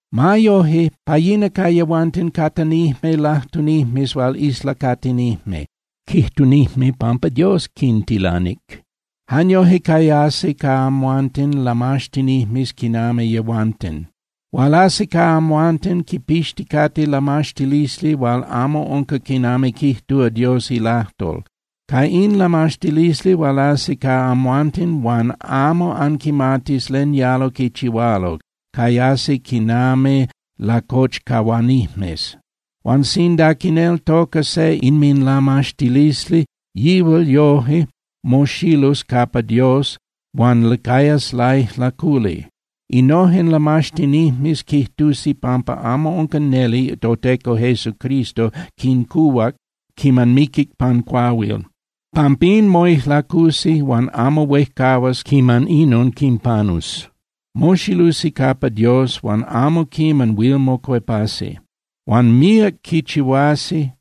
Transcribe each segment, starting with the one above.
Ma yoje, pa yina ca yehuanten catanijme lajtunijmes hual islacatinijme, quijtunijme pampa Dios quintilanic. Jan yoje cayasi ca amhuanten lamaxtinijmes quinami yehuanten. Hualasi ca amhuanten quipixticate lamaxtilisli hual amo unca quinami quijtúa Dios ilajtol. Ca in lamaxtilisli hualasi ca amhuanten huan amo anquimatis len yalo quichihualo, cayasi quinami lacochcahuanijmes. Huan sinda quineltoca se inminlamaxtilisli, yihual yoje moxilus capa Dios huan cayas laijlaculi. Innojen lamaxtinijmes quijtusi pampa amo unca neli toTeco Jesucristo quincuhuac quiman miquic pan cuahuil. Pampín moijlacusi huan amo huejcahuas quiman inon quinpanus. Moxilusi capa Dios huan amo quiman huil mocuepasi. Huan míac quichihuasi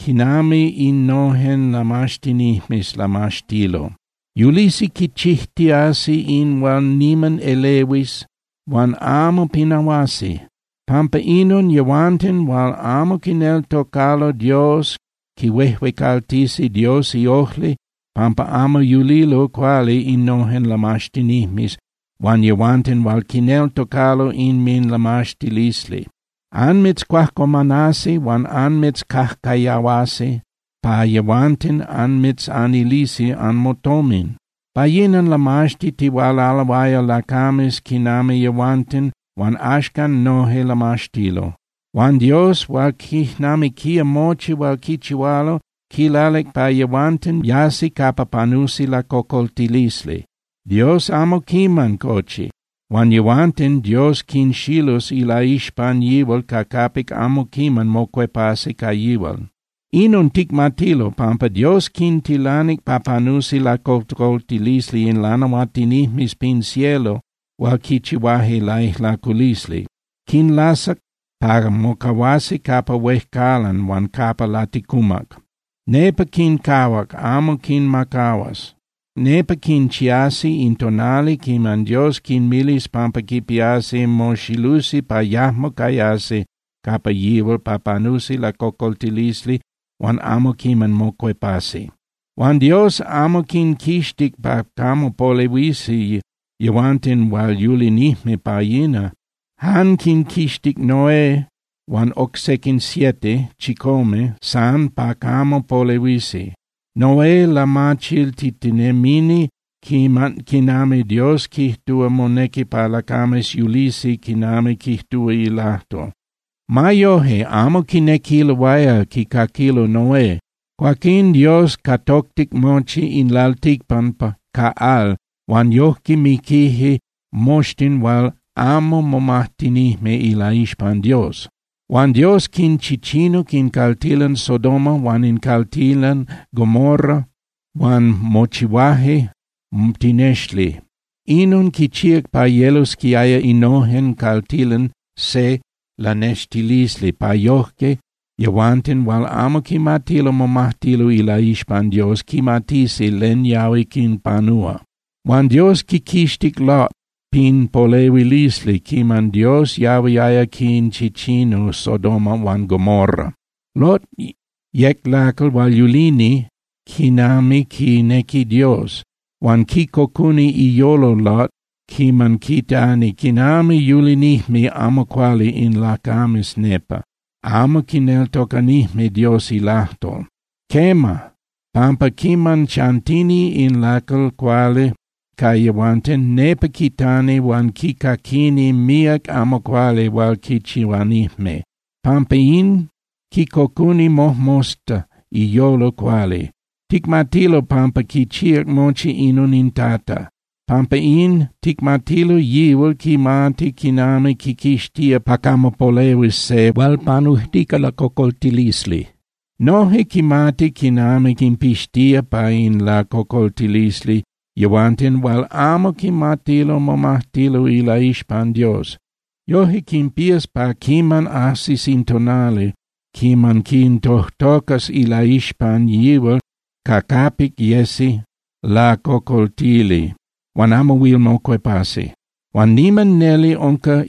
quinami innojen lamaxtinijmes lamaxtilo. Yulisi quichijtiasi in hual niman elehuis huan amo pinahuasi. Pampa inon yehuanten hual amo quineltocalo Dios quihuejuecaltisi Dios iojli pampa amo yulilo cuali innojen lamaxtinijmes huan yehuanten hual quineltocalo inminlamaxtilisli. Anmitzcuajcuamanasi huan anmitzcajcayahuasi pa yehuanten anmitzanilisi anmotomin. Pa yina lamaxtitihualaloaya lacames quinami yehuanten huan axcan noje lamaxtilo. Huan Dios hual quijnamiquía mochi hual quichihualo, quilalic pa yehuanten yasi capa panusi lacocoltilisli. Dios amo quiman cochi, huan yehuanten Dios quinxilus ilaixpan yihual ca capic amo quiman mocuepasi ca yihual. Inon ticmatilo, pampa Dios quintilanic pa panusi lacocoltilisli in lanahuatinijmes pin cielo hual quichihuaje laijlaculisli. Quinlasac pa mocahuasi capa huejcalan huan capa laticumac. Nepa quincahuac, amo quinmacahuas. Nepa quinchiasi in tonali quiman Dios quinmilis pampa quipiasi moxilusi pa yajmo cayasi capa yihual pa panusi lacocoltilisli huan amo quiman mocuepasi. Huan Dios amo quinquixtic pa camo polehuisi yehuanten hual yulinijme pa yina. Jan quinquixtic Noé huan oc sequin siete (chicome) san pa camo polehuisi. Noé lamachiltitinemini quinami Dios quijtúa monequi pa lacames yulisi quinami quijtúa ilajtol. Ma yoje, amo quinequiloaya quicaquilo Noé. Cuaquín Dios catoctic mochi in lalticpan ca al huan yojque miquije moxtin hual amo momajtinijme ilaixpan Dios. Huan Dios quinchichinuc in caltilan Sodoma huan in caltilan Gomorra huan mochihuaje tinexli. Inon quichíac pa yelosquiaya innojen caltilan se lanextilisli, pa yoje yehuanten hual amo quimatilo momajtilo ilaixpan Dios quimatisi len yahui quinpanúa. Huan Dios quiquixtic Lot pin polehuilisli quiman Dios yahuiaya quinchichinu Sodoma huan Gomorra. Lot yec lacal hual yulini quinami quinequi Dios. Huan quicocuni iyolo Lot quiman quitani quinami yulinijme amo cuali in lacames nepa, amo quineltocanijme Dios ilajtol. Quema, pampa quiman chantini in lacal cuali ca yehuanten, nepa quitani huan quicaquini míac amo cuali hual quichihuanijme. Pampa in, quicocuni mojmosta iyolo cuali. Ticmatilo pampa quichíac mochi inon in Tata. Pampa in, ticmatilo yihual quimati quinami quiquixtía pa camo polehuis se hual panujtica lacocoltilisli. Noje quimati quinami quinpixtía pa in lacocoltilisli yehuanten hual amo quimatilo momajtilo ilaixpan Dios. Yojque quinpías pa quiman ajsis in tonali quiman quintojtocas ilaixpan yihual ca capic yesi lacocoltili huan amo huil mocuepasi. Huan niman neli unca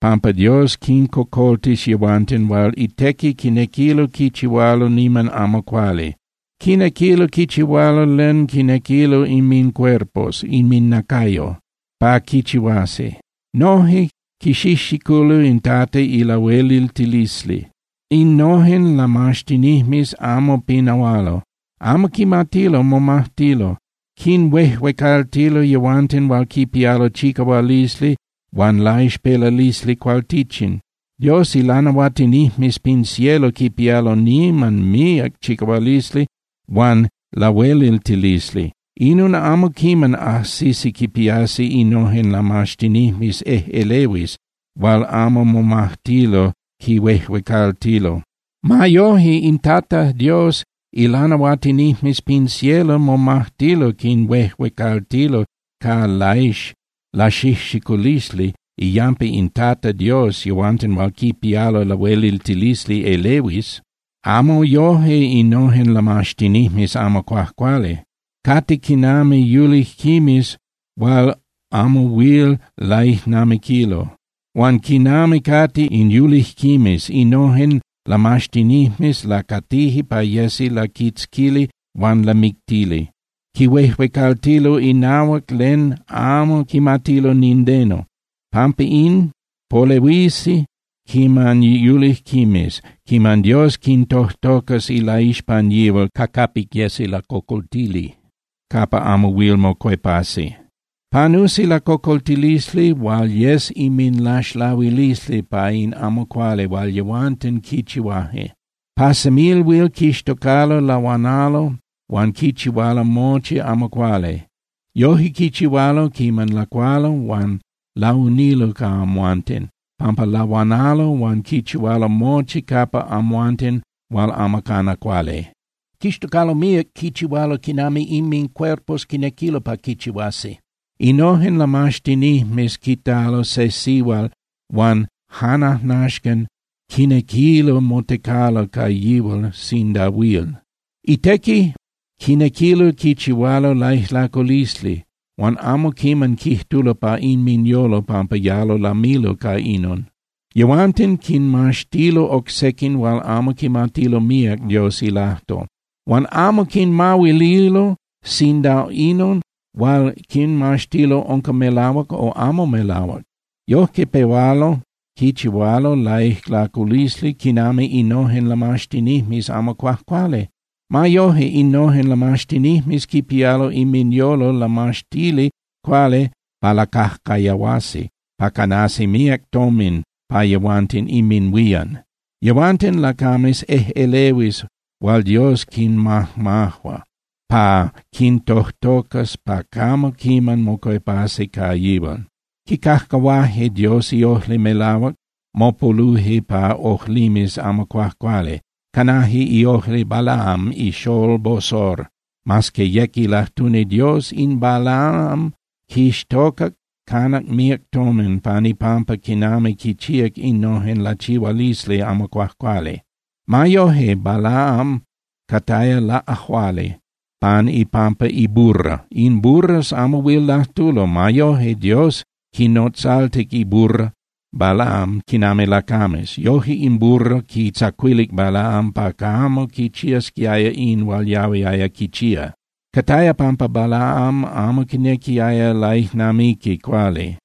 pampa Dios quincocoltis yehuanten hual itequi quinequilo quichihualo niman amo cuali. Quinequilo quichihualo len quinequilo inmincuerpos (inminacayo) pa quichihuasi, noje quixijxiculo in Tata ilahueliltilisli. Innojen lamaxtinijmes amo pinahualo. Amo quimatilo momajtilo. Quinhuejuecaltilo yehuanten hual quipialo chicahualisli huan laixpelalisli cualtichin. Dios ilanahuatinijmes pin cielo quipialo niman míac chicahualisli huan lahueliltilisli. Inon amo quiman ajsisi quipiasi innojen lamaxtinijmes ejꞌelehuis hual amo momajtilo quinhuejuecaltilo. Ma yoje, in Tata Dios ilanahuatinijmes pin cielo momajtilo quinhuejuecaltilo ca laxijxiculisli iyampa in Tata Dios yehuanten hual quipialo lahueliltilisli elehuis. Amo yoje innojen lamaxtinijmes amo cuajcuali. Cate quinami yulijquimes hual amo huil laijnamiquilo. Huan quinami cate in yulijquimes, innojen lamaxtinijmes lacatije pa yesi laquitzquili huan lamictili. Quihuejuecaltilo inahuac len amo quimatilo nindeno. Pampa in, polehuisi quinami yulijquimes quiman Dios quintojtocas ilaixpan yihual ca capic yesi lacocoltili, capa amo huil mocuepasi. Panusi lacocoltilisli hual yes inminlaxlahuilisli pa in amo cuali hual yehuanten quichihuaje. Pa semilhuil quixtocalo lahuanalo huan quichihualo mochi amo cuali. Yoje quichihualo quiman lacualo huan launilo ca amhuanten, pampa lahuanalo huan quichihualo mochi capa amhuanten hual amo cana cuali. Quixtocalo míac quichihualo quinami inmincuerpos quinequilo pa quichihuasi. Innojen lamaxtinijmes quitalo se sihual huan janajnaxcan quinequilo motecalo ca yihual sinda huil. Itequi quinequilo quichihualo laijlaculisli huan amo quiman quijtulo pa inminyolo pampa yalo lamilo ca inon. Yehuanten quinmaxtilo oc sequin hual amo quimatilo míac Dios ilajtol huan amo quinmahuililo sinda inon hual quinmaxtilo unca melahuac o amo melahuac. Yojque pehualo quichihualo laijlaculisli quinami innojen lamaxtinijmes amo cuajcuali. Ma yoje, innojen lamaxtinijmes quipialo inminyolo lamaxtili cuali pa lacajcayahuasi pa canasi míac tomin pa yehuanten inminhuían. Yehuanten, lacames ejꞌelehuis hual Dios quinmajmajua pa quintojtocas pa camo quiman mocuepasi ca yihual. Quicajcahuaje Dios iojli melahuac, mopoluje pa ojlimes amo cuajcuali. Canaje iojli Balaam ixolol Bosor. Mas que yec ilajtuni Dios, in Balaam quixtocac canac míac tomin pan ipampa quinami quichíac innojen lachihualisli amo cuajcuali. Ma yoje, Balaam cataya laꞌajuali pan ipampa iburra. In burras amo huil lajtulo. Ma yoje Dios quinotzaltic iburra Balaam quinami lacames. Yoje in burra quitzacuilic Balaam pa camo quichiasquiaya in hual yahuiaya quichía. Cataya pampa Balaam amo quinequiaya laijnamiqui cuali.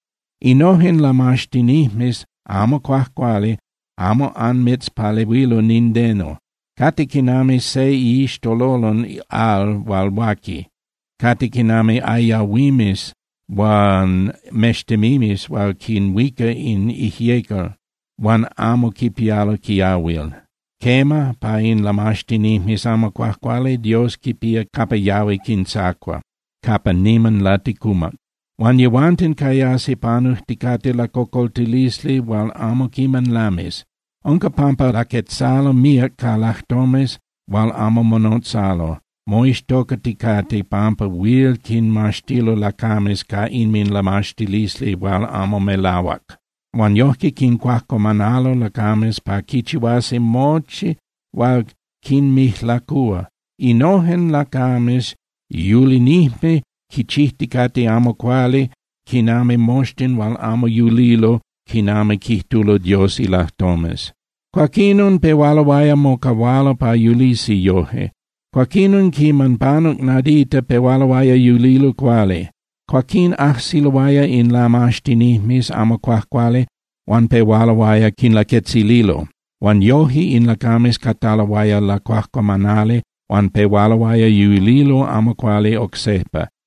Innojen lamaxtinijmes amo cuajcuali amo anmitzpalehuilo nindeno. Cate quinami se iixtololon al hual huaqui, cate quinami ayahuimes huan mextemimes hual quinhuica in ijyecal huan amo quipialo quiahuil. Quema, pa in lamaxtinijmes amo cuajcuali, Dios quipía capa yahui quintzacua, capa niman laticumac. Huan yehuanten cayasi panujticate lacocoltilisli hual amo quiman lamis. Unca pampa laquetzalo míac ca lajtomes hual amo monotzalo, moixtocaticate pampa huil quinmaxtilo lacames ca inminlamaxtilisli hual amo melahuac. Huan yojque quincuajcuamanalo lacames pa quichihuasi mochi hual quinmijlacúa. Innojen lacames yulinijme quichijticate amo cuali quinami moxtin hual amo yulilo quinami quijtulo Dios ilajtomes. Cuaquinon pehualoaya mocahualo pa yulisi yoje. Cuaquinon quiman panuc nadita pehualoaya yulilo cuali. Cuaquín ajsiloaya in lamaxtinijmes amo cuajcuali huan pehualoaya quinlaquetzililo, huan yoje in lacames cataloaya lacuajcuamanali huan pehualoaya yulilo amo cuali oc sejpa.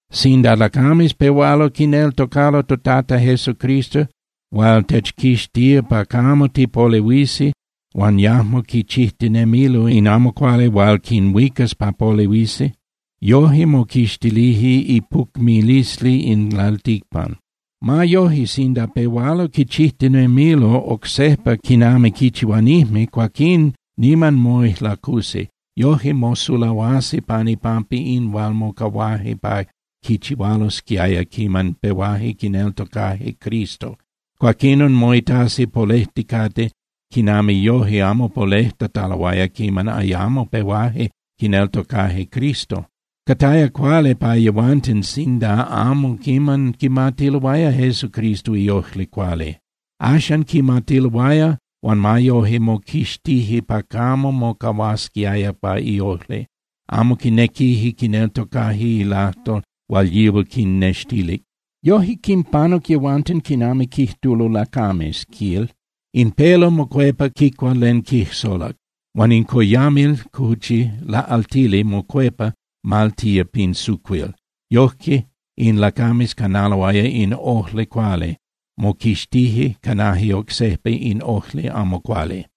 Sinda lacames pehualo quineltocalo toTata Jesucristo hual techquixtía pa camo tipolehuisi huan yajmo quichijtinemilo in amo cuali hual quinhuicas pa polehuisi, yoje moquixtilije ipucmilisli in lalticpan. Ma yoje, sinda pehualo quichijtinemilo oc sejpa quinami quichihuanijme, cuaquín niman moijlacusi. Yojque mosulahuasi pan ipampa in hual mocahuaje pa quichihualosquiaya quiman pehuaje quineltocaje Cristo. Cuaquinon moitasi polejticate quinami yoje amo polejtataloaya quiman ayamo pehuaje quineltocaje Cristo. Cataya cuali pa yehuanten sinda amo quiman quimatiloaya Jesucristo iojli cuali. Axan quimatiloaya huan ma yoje moquixtije pa camo mocahuasquiaya pa iojli, amo quinequije quineltocaje ilajtol hual yihual quinnextilic. Yoje quinpanuc yehuanten quinami quijtulo lacames, quil: “In pelo mocuepa quicua len quijsolac, huan in coyamil (cuchi) laꞌaltili mocuepa maltía pin sucuil.” Yojque in lacames canaloaya in ojli cuali, moquixtije, canaje oc sejpa in ojli amo cuali.